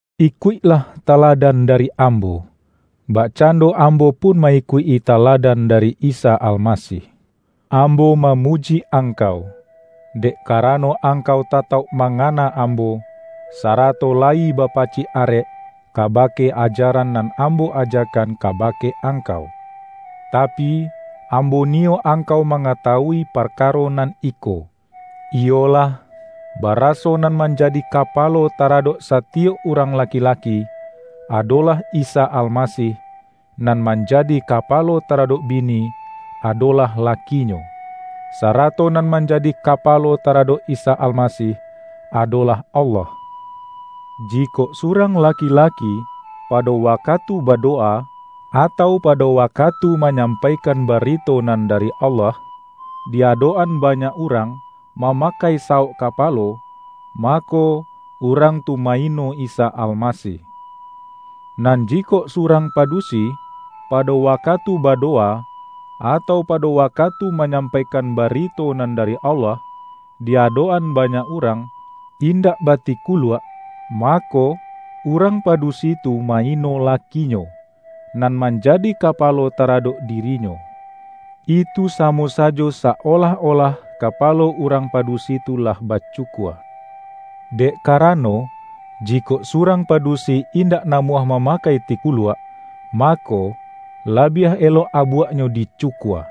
Ikuiklah taladan dari ambo, bakcando ambo pun ma-ikuik-i taladan dari Isa Almasih. Ambo mamuji angkau, dek karano angkau tatauk mangana ambo, sarato layi bapacik arek kabake ajaran nan ambo ajakan kabake angkau. Tapi, ambo niyo angkau mangatawui parka-ro nan iko, iyolah, baraso nan manjadi kapalo taradok satiyok urang laki-laki, adolah Isa Almasih; nan manjadi kapalo taradok bini, adolah lakinyo, sarato nan manjadi kapalo taradok Isa Almasih, adolah Allah. Jikok surang laki-laki, pado wakatu badowa, atau pado wa-katu manyampaikan barito nan dari Allah, di-adok-an banyak urang, ma-makai sawok kapalo, mako, urang tu ma-ino Isa Almasih. Nan jikok surang padusi, pado wakatu badowa, atau pa-do wakatu manyampaikan barito nan dari Allah, di-adok-an banyak urang, indak batikuluak, mako, urang padu-si tu ma-ino lakinyo, nan manjadi ka-palo taradok dirinyo. Itu samo sajo sa-olah-olah kapalo urang padusi tu lah bacukua. Dek karano, jikok surang padusi indak namuah mamakai tiku-luak, mako, labiah elok abuaknyo di-cukua.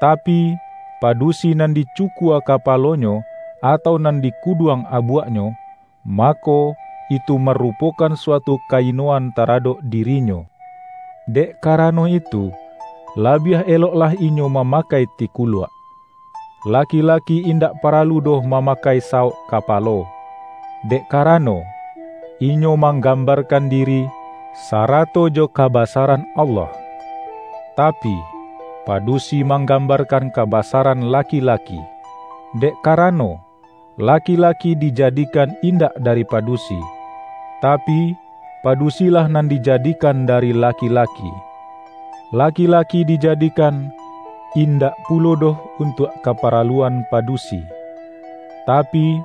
Tapi, padusi nan dicukua kapa-lonyo, atau nan dikuduang abuaknyo, mako, itu marupokan suatu ka-inoan taradok dirinyo. Dek karano itu, la-biah eloklah inyo mamakai tikuluak. Laki-laki indak paralu doh mama-kai sawok kapalo, dek karano, inyo manggambarkan diri, sarato jo kaba-saran Allah. Tapi, padusi manggam-barkan kabasaran laki-laki, dek ka-rano, laki-laki dijadikan indak dari padusi, tapi, padusilah nan dijadikan dari laki-laki. Laki-laki dijadikan, in-dak pulo doh untuak kaparaluan padusi, tapi,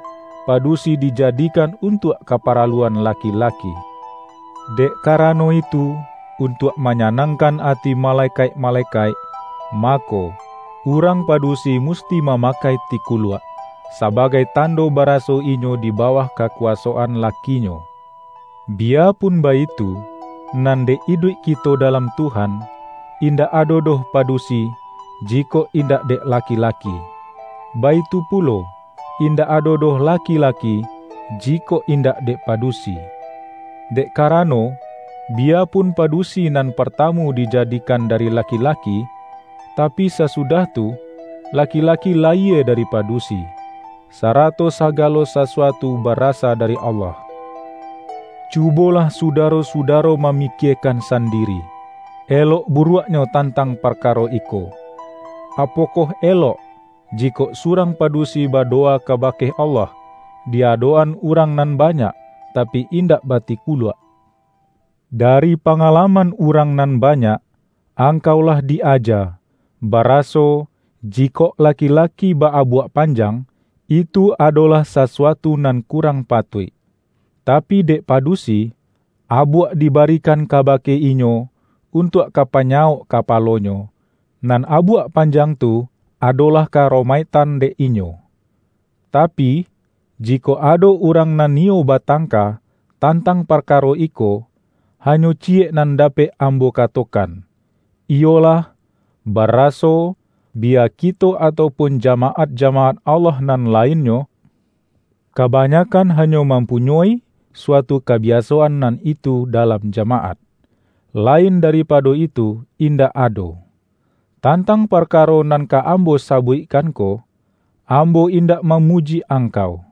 padusi dijadikan untuak ka-paraluan laki-laki. Dek karano itu, untuak manyanangkan ati malekaik-malekaik, mako, urang padusi musti mamakai tikuluak, sabagai tando ba-raso inyo di bawah kakuwasoan laki-nyo. Biyapun baitu, nan dek iduik kito dalam Tuhan, indak ado doh pa-dusi, jikok indak dek laki-laki, baitu pulo, indak ado doh laki-laki, jikok indak dek padusi. Dek karano, bi-yapun padusi nan partamu dijadikan dari laki-laki, tapi sasudah tu, laki-la-ki layie dari padusi; sarato sagalo sa-suatu barasa dari Allah. Cubolah sudaro-sudaro mamikie-kan sandiri, elok buruaknyo tantang parkaro iko: Apokoh elok, jikok surang padusi badowa kabake Allah, di adok-an urang nan banyak, tapi indak ba-tikuluak? Dari pangalaman urang nan banyak, angkau lah di-aja, bara-so, jikok laki-laki ba-abuak panjang, itu adolah sasuatu nan kurang patuik. Tapi dek padusi, abuak dibarikan kabake inyo, untuak ka panyawok ka-palonyo, nan abuak panjang tu ado-lah ka-aromaiktan dek inyo. Tapi, jikok ado urang nan niyo batangka, tantang parkaro iko, hanyo ciyek nan dapek ambo katokan, iyolah, bara-so, biya kito atau pun jamaat-jama-at Allah nan lainnyo, kabanyakkan hanyo mampunyoi suatu kabiasoan nan itu dalam jamaat; lain daripado itu indak ado. Tantang parkaro nan ka ambo sa-buikkan ko, ambo indak mamuji ang-kau.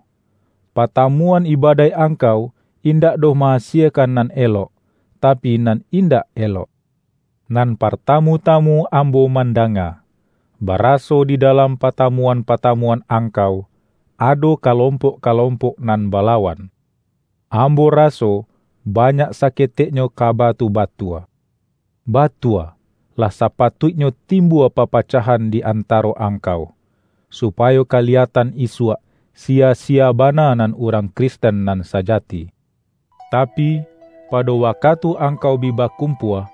Patamuan ibadaik angkau indak doh ma-asiekan nan elok, tapi, nan in-dak elok. Nan partamu-tamu ambo mandanga, baraso di dalam patamu-an-patamuan angkau, ado kalompok-kalompok nan balawan. Ambo raso banyak saketeknyo kaba tu batua. Batua, lah sapatuiknyo timbua papacahan di antaro angkau, supayo ka-liyatan isuak, siya-siya bana nan urang Kristen nan sajati. Tapi, pado waka-tu angkau bi bakumpua,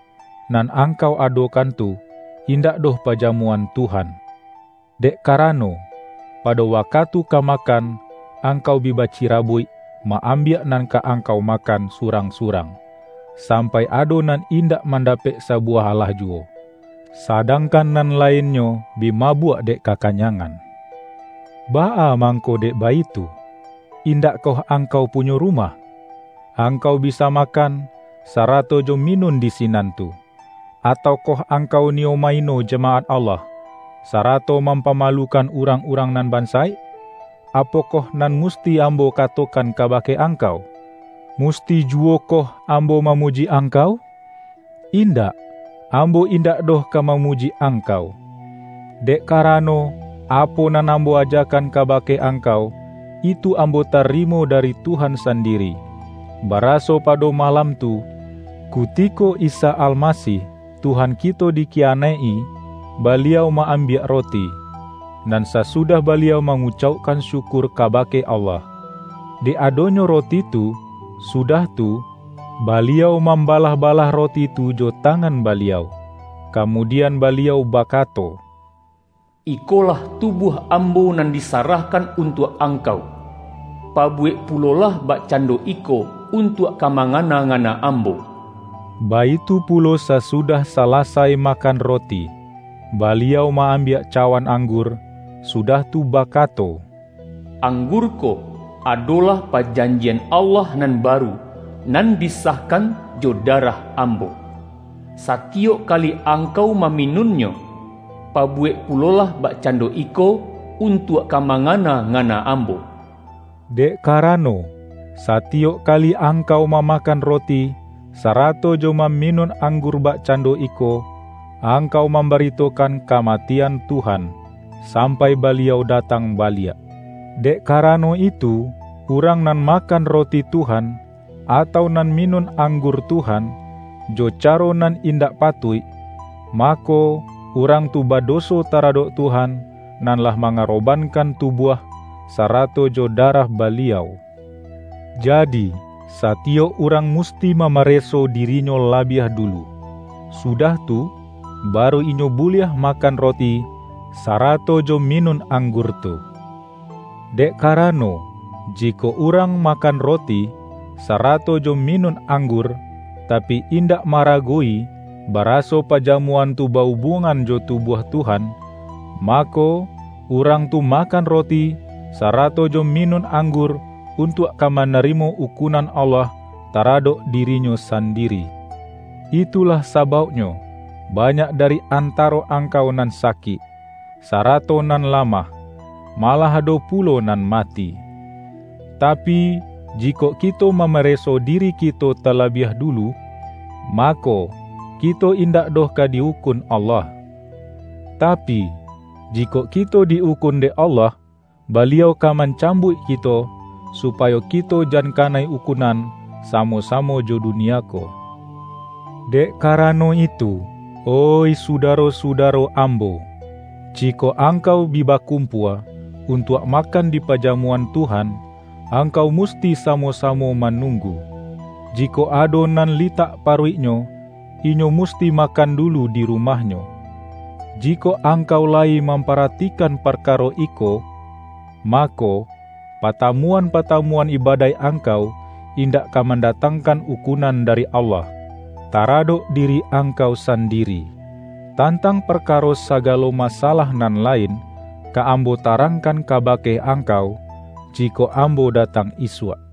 nan angkau adokan tu, indak doh Pajamuan Tuhan. Dek karano, pado wakatu ka ma-kan, angkau bi bacirabuik ma-ambiak nan ka angkau makan surang-surang, sampai ado nan indak mandapek sabu-wah alah juwo, sadangkan nan lainnyo bi mabuak dek kakanyangan. Baa mangko dek baitu? Indakkoh angkau punyo rumah? Angkau bisa makan, sarato jo minun di sinan tu! Ataukoh angkau niyo ma-ino jamaat Allah, sa-rato mampamalukan urang-urang nan bansaik? Apokoh nan musti ambo ka-tokan kabake angkau? Musti juwokoh ambo mamuji angkau? Indak! Ambo indak doh ka mamuji angkau. Dek karano, apo nan ambo aja-kan kabake angkau, itu ambo tarimo dari Tuhan sandiri: baraso pado ma-lam tu, kutiko Isa Almasih, Tuhan kito dikiyanaik-i, Baliau ma-ambiak roti, nan sasudah Baliau mangucaukkan syukur kabake Allah, dek adonyo ro-ti tu, sudah tu, Baliau mambalah-ba-lah roti tu jo tangan Baliau, kamu-dian Baliau bakato,”Ikolah tubuah Ambo nan disarahkan untuak ang-kau. Pabuwek pulolah bakcando iko, untuak ka mangana-ngana Ambo.” Baitu pulo sasudah salasai makan roti, Baliau ma-ambiak cawan anggur, sudah tu bakato,”Anggur ko, adolah pajanjian Allah nan baru, nan disah-kan jo darah Ambo. Satiyok kali ang-kau maminunnyo, pabuwek pulolah bakcando iko, untuak ka mangana-ngana Ambo.” Dek karano, satiyok kali angkau mamakan roti, sarato jo maminun anggur bakcando iko, ang-kau mambaritokan kamatian Tuhan, sampai Baliau datang baliak. Dek karano itu, urang nan ma-kan roti Tuhan, atau nan minun ang-gur Tuhan, jo caro nan indak patuik, mako, urang tu badoso taradok Tuhan nan lah mangarobankan tubuah, sa-rato jo darah Baliau. Jadi, satiyok urang musti mamareso dirinyo labiah dulu, sudah tu, baru inyo buliah ma-kan roti, sarato jo minun anggur tu. Dek karano, jikok urang makan ro-ti, sarato jo minun anggur, tapi in-dak ma-aragowi, baraso pajamuan tu ba-ubuangan jo tubuah Tuhan, mako, urang tu makan roti, sarato jo minun anggur, untuak ka manarimo ukunan Allah taradok dirinyo sandiri. Itulah sabauknyo, banyak dari antaro ang-kau nan sakik, sarato nan lamah, ma-lah ado pulo nan mati. Tapi, jikok kito mamareso diri kito talabiah du-lu, mako, kito indak doh ka di-ukun Allah. Tapi, jikok kito di-ukun dek Allah, Baliau ka mancambuik kito, su-payo kito jan kanai ukunan samo-sa-mo jo dunia ko. Dek karano itu, oih sudaro-suda-ro ambo, jikok angkau bi bakumpua, untuak makan di pajamuan Tuhan, angkau musti samo-samo manung-gu. Jikok ado nan litak paruiknyo, inyo musti makan dulu di rumahnyo. Jikok angkau layi mamparatikan par-karo iko, mako, patamuan-patamuan ibadaik angkau, indak ka mandatang-kan ukunan dari Allah, taradok diri angkau sandiri. Tantang parkaro sa-galo masalah nan lain, ka ambo ta-rangkan kabake angkau, jikok ambo datang isuak.